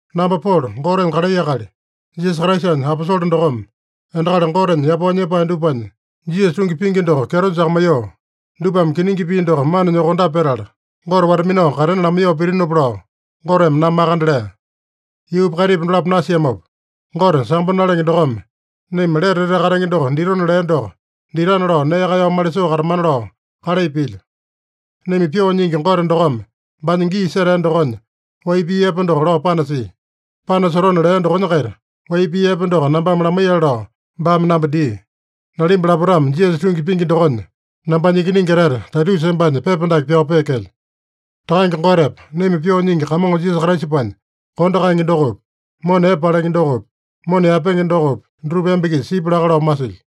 Namba Polo, Gotenya kalai akali, Jisasa Kraisanya aposole dokome, endakali Gotenya yapao nyepae dupanya Jisasa tungi pingi doko kyeto jakamaiyoo, dupame kiningi pii doko mana nyokondape petala, Gote wata-minao katena lamaiyoo pitinopa lao, Goteme namba makande lea. Yuupa kaitipa dolapo nasiamopa, Gote sambo nalenge dokome naima lete etete katenge doko ditona lea doko ditana lao nee kaeyao malisoo katamana lao kalai pilyo. Naima Pyoo Nyingi Gote dokome baanya gii setea dokonya wai pii epe doko lao panasia. Panasotona lea dokonya-kaita wai pii epe doko nambame lamaiyale lao baame namba dia. Nalimba lapotame Jisasa tungi pingi dokonya, nambanya ikiningi etete Taitusa embanya pepa dake pyao peekelyo. Takange Gotepa naima Pyoo Nyingi Kamongo Jisasa Kraisapanya kondo kaenge dokopi, mona epe palenge dokopi, mona yaepenge dokopi, dutupa emba-kisa sipya laka lao masilyo.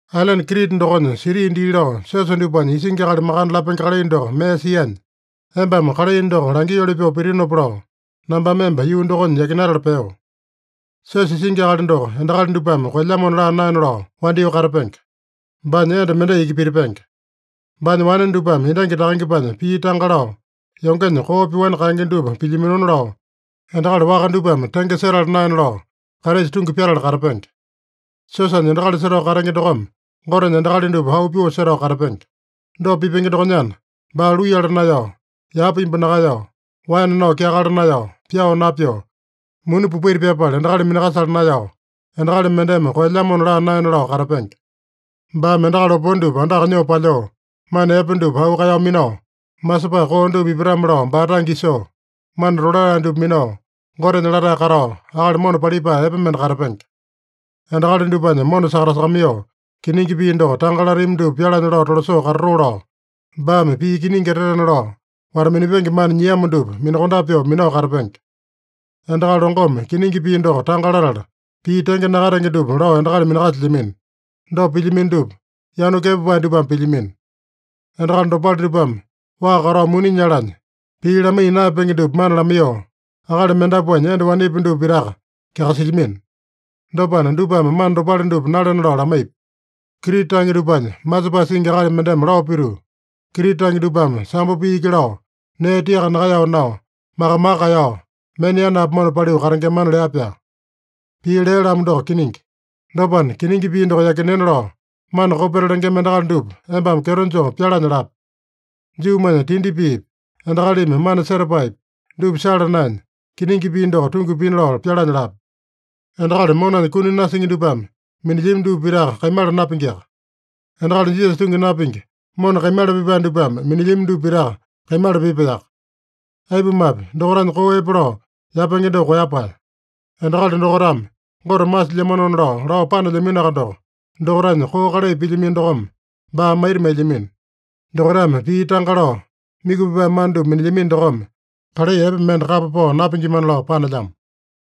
Ailene Krita dokonya siti dii lao siosa dupanya isingi akali makande lapenge kalai doko mee sianya, embame kalai doko langioli pyoo pitinopa lao, nambame emba yuu dokonya yakinatala peo. Siosa isingi akali doko endakali dupame koelyamona laa naena lao wandyoo katapenge. Baanya enda mendai iki pitipenge. Baanya wane dupame endangi takangepanya pii tanga lao, yongenya koo pyoani kaenge dupa pilyaminona lao, endakali waka dupame tenge setala naena lao, Kraisa tungi pyatala katapenge. Siosanya endakali setao katenge dokome Gotenya endakali dupa auu pyoo setao katapenge. Dopa pipenge dokonyana, baa luiyala naeyao, yapa imbu nakaeyao, waene nao kyakala naeyao, pyao napyoo, muni popaita pyapala endakali minakasala naeyao, endakali mendeme koelyamona laa naena lao katapenge. Baame endakali opone dupa andaka nyoo palyoo, mana epe dupa auu kaeyao minao, masepae koo dupa ipatame-lao baa tange isoo, mana tolatae dupa minao, Gotenya latae katao, akali mona palipae epe mende katapenge. Endakali dupanya mona sakatasakamaiyoo, kiningi pii doko tanga latami dupa pyalanya lao tolasoo katatoo lao, baame pii kiningi etetena lao wata-minapenge mana nyiamo dupa minakondape pyoo minao katapenge. Endakali longome kiningi pii doko tanga latala, pii tenge nakatenge dupa lao endakali minakasilyamino. Dopa pilyamino dupa, yanu kepapae dupame pilyamino. Endakali dopale dupame waa katao muni nyalanya, pii lamaiya naeyapenge dupa mana lamaiyoo, akali mendapuanya enda wanepi dupa pitaka kyakasilyamino. Dopana, dupame mana dopale dupa nalena lao lamaipi. Krita tange dupanya masepae singi akali mendeme lao pituu, “Krita tange dupame sambo pii iki lao, nee tiaka nakaeyao nao, maka-maka kaeyao, mena yanapi mona paliu katengemana” lea-pyaa. Pii lea-lamo doko kiningi. Dopana, kiningi pii doko yakinena lao mana kopeta lengema endakali dupa embame kyeto joo pyalanya lape. Juumanya tindi piipi, endakalimi mana setapaepi, dupa sala naenya, kiningi pii doko tungi pina lao pyalanya lape. Endakali monanya kuni nasingi dupame minilyami dupa pitaka kaimala napingiaka. Endakali Jisasa tungi napingi, mona kaimala pipae dupame minilyami dupa pitaka kaimala pipaeyaka. Aipumape, dokaitanya koo epe lao yapenge doko koeyapae. Endakali dokaitame Gote masilyamanona lao, lao panelyaminoaka doko, dokaitanya koo kalai pilyamino dokome baa maita mailyamino. Dokaitame pii tanga lao, myuku pipae mana dupa minilyamino dokome, kalai epe mende kapa pao napingimana lao panelyamo.